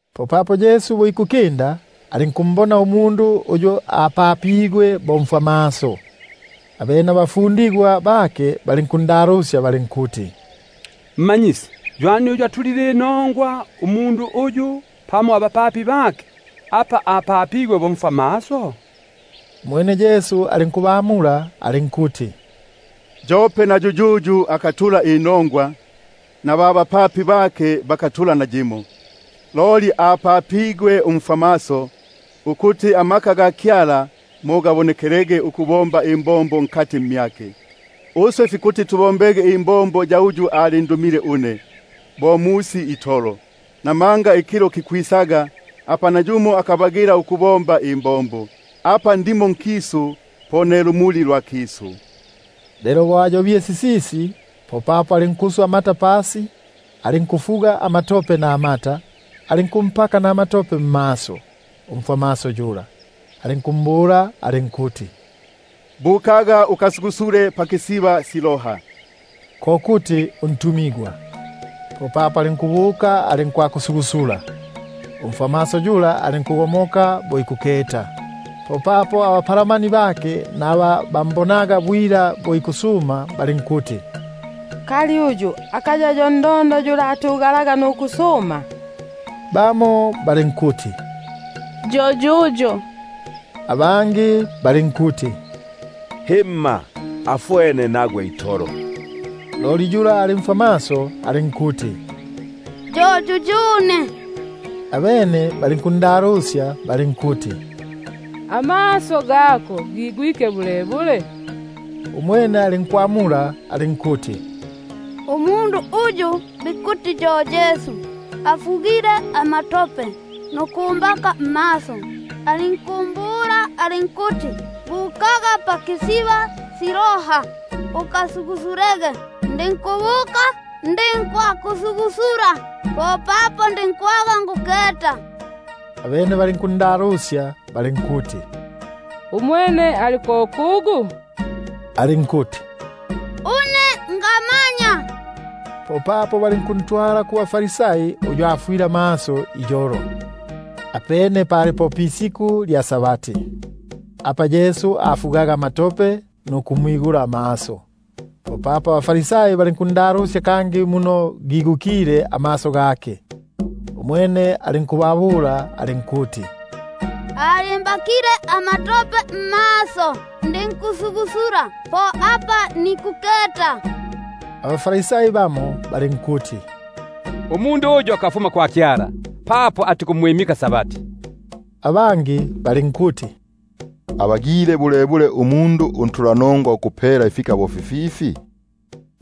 Lelo bo ikukinda, popapo alinkumbona umundu uyu apapigwe bo mfwamaso. Abene abafundigwa bake balinkundalusya balinkuti: Rabi,#Rabi ko kuti Mmanyisi. ywani uyu atulile inongwa, umundu uyu, pamo abapapi bake; papo apapigwe mfwamaso itolo? Umwene Yesu alinkubamula alinkuti: Yope na yuyuyu akatula inongwa, na ba bapapi bake bakatula nayimo. Loli apapigwe umfwamaso, ukuti imbombo sya Kyala mo sibonekelege mmyake. Uswe fikuti tubombege imbombo ya uyu alindumile une, bo musi itolo; buno ikilo kikwisaga, apa nayumo akabagila ukubomba. Apa ndimo nkisu, po ne lumuli lwa kisu. Lelo bo ayobile sisisi, popapo alinkuswa amata pasi, alinkufuga amatope namata, alinkumpaka nama- tope mmaso, alinkumbula alinkuti: Bukaga ukasugusule pakisiba Siloa (ko kuti ntumigwa). Popapo alinkubuka, alinkwakusugusula; alinkugomoka bo ikuketa itolo. Popapo abapalamani bake naba bambonaga bwila bo ikusuma balinkuti: Kali uyu akaya yo yula atugalaga nuku- suma? Bamo balinkuti: Yo yuyo; abangi balinkuti: Himma, afwene nagwe itolo. Umwene alinkuti: Yo yuyune. Abene balinkundalusya balinkuti: Amaso gako gigwike bulebule? Umwene alinkwamula alinkuti: Umundu uyu bikuti yo Yesu, afugile amatope nukumbaka kumaso; alinkumbula alinkuti: Bukaga pa-Siloa ukasugusulege. Ndinkubuka, ndinkwakusugusula, popapo ndinkwaga nikuketa. Abene balinkundalusya balinkuti: Umwene ali ko kugu? Alinkuti: Ngamanya. Popapo balinkuntwala kubaFarisai uyu afwile amaso iyolo. Apene pali po pisiku lya Sabati, apa Yesu afugaga amatope nukumwigula amaso. Popapo abaFarisai balinkundalusya kangi muno gigukile amaso gake. Umwene alinkubabula alinkuti: Alimbakile amatope mmaso, ndinkusugusula, po apa nikuketa. Bamo abaFarisai balinkuti: Umundu uyu akafuma kwa Kyala, papo atikumwimika Sabati; abangi balinkuti: Abagile bulebule umundu untulanongwa ukupela ifika bo fififi?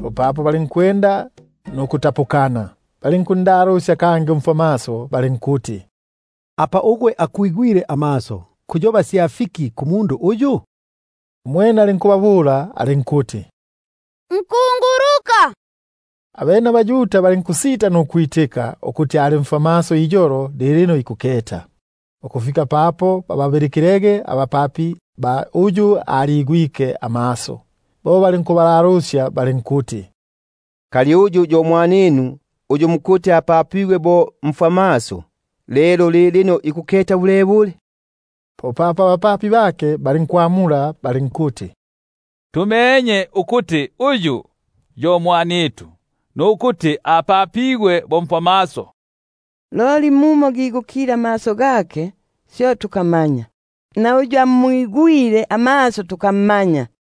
Popapo balinkwenda nukutapukana. Popapo balinkundalusya umfwamaso balinkuti: Ugwe kwinogona sya fiki kumundu uyu, apa akwigwile amaso? Umwene alinkuti: Nkunguluka. Abene abaYuda balinkusita nukwitika ukuti ali mfwamaso kangi ikuketa, ukufika papo bababilikilege abapapi ba uyu aligwike amaso. Bo balinkubalalusya balinkuti: Kali uyu yo mwaninu, uyu mukuti apapigwe bo mfwamaso? Lelo ikuketa bulebule lilino? Popapo abapapi bake balinkwamula balinkuti: Tumenye ukuti uyu yo mwanitu nukuti apapigwe bo mfwamaso, loli muno gigukile amaso gake, syo tukamanya; na uyu amwigwile amaso tukammanya.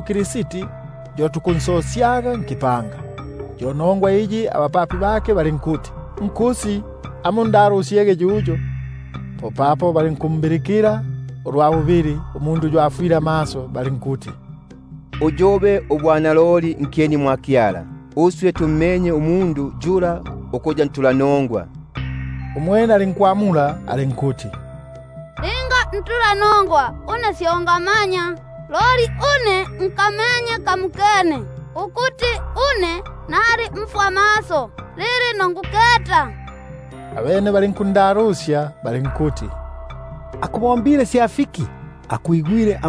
Kristi, yo tukunsosyangamo mu-Sinagogi. Yo nongwa iyi abapapi bake balinkuti: Nkusi, amundalusyege yuyo. Popapo balinkumbilikila ulwa bubili, umundu uyu afwile amaso, balinkuti: Umwimikege Kyala; uswe tummenye umundu yula ukuya ntulanongwa. Umwene alinkwamula alinkuti: Linga ntulanongwa, syo ngamanya; une nkamenye kamokene, ukuti nali mfwamaso, lilino nikuketa. Abene balinkundalusya balinkuti: Akubombile sya fiki? Akwigwile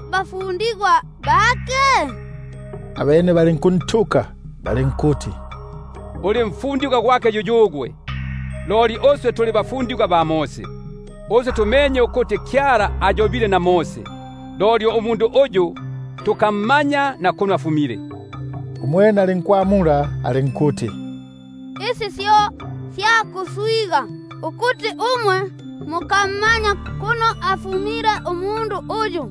bafundigwa bake? Abene balinkuntuka balinkuti: Uli mfundigwa gwake yuyugwe, loli uswe tuli bafundigwa ba Mose. Uswe tumenye ukuti Kyala ayobile na Mose, loli uyu tukammanya na kuno afumile. Umwene alinkwamula alinkuti: Isi syo sya kuswiga, ukuti umwe mukammanya kuno afumile umundu uyu,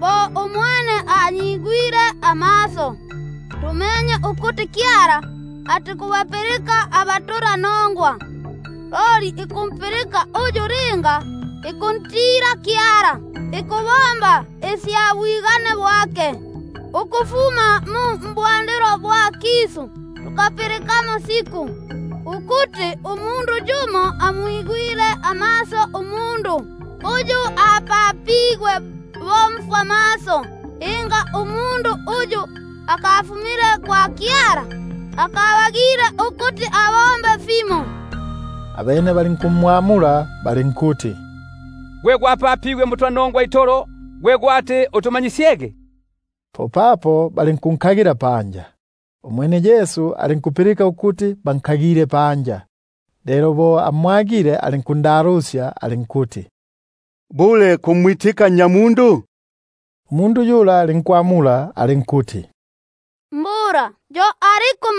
bo umwene anyigwile amaso. Uswe tumenye ukuti Kyala atikubapilika abatulanongwa, loli uyu linga ikuntila Kyala, ikubomba isya bwigane bwake, yo ikutupilika. Tukapilikamo siku ukuti yumo amwigwile amaso umundu, uyu apapigwe bo mfwamaso. Linga umundu uyu akafumile kwa Kyala, akabagile ukuti abombe fimo. Abene balinkumwamula balinkuti: Gwe gwapapigwe mbutulanongwa itolo, gwe gwati utumanyisyege? Popapo balinkunsosya panja. Umwene Yesu alinkupilika ukuti bansosisye panja; lelo bo amwagile, popapo alinkumbula alinkuti: Bule kumwitika Nnyamundu? Umwene alinkwamula alinkuti: Yo aliku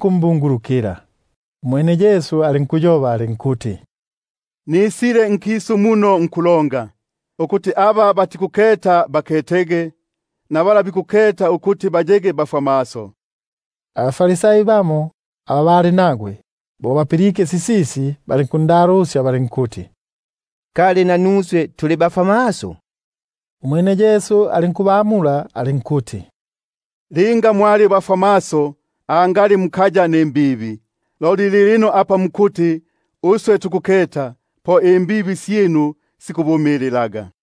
mbungulukila. Umwene Yesu alinkuyoba alinkuti: Nkisu muno nisile ku kulonga, ukuti aba batikuketa baketege, naba bikuketa ukuti bayege bafwamaso. Bamo abaFarisai aba bali nagwe, bo bapilike sisisi, balinkundalusya balinkuti: Ngimba nanuswe tuli bafwamaso? Umwene Yesu alinkubamula alinkuti: Linga mwali bafwamaso, angali mukaya nimbibi; loli lilino apa mukuti: Tukuketa, po imbibi syinu sikubumililaga.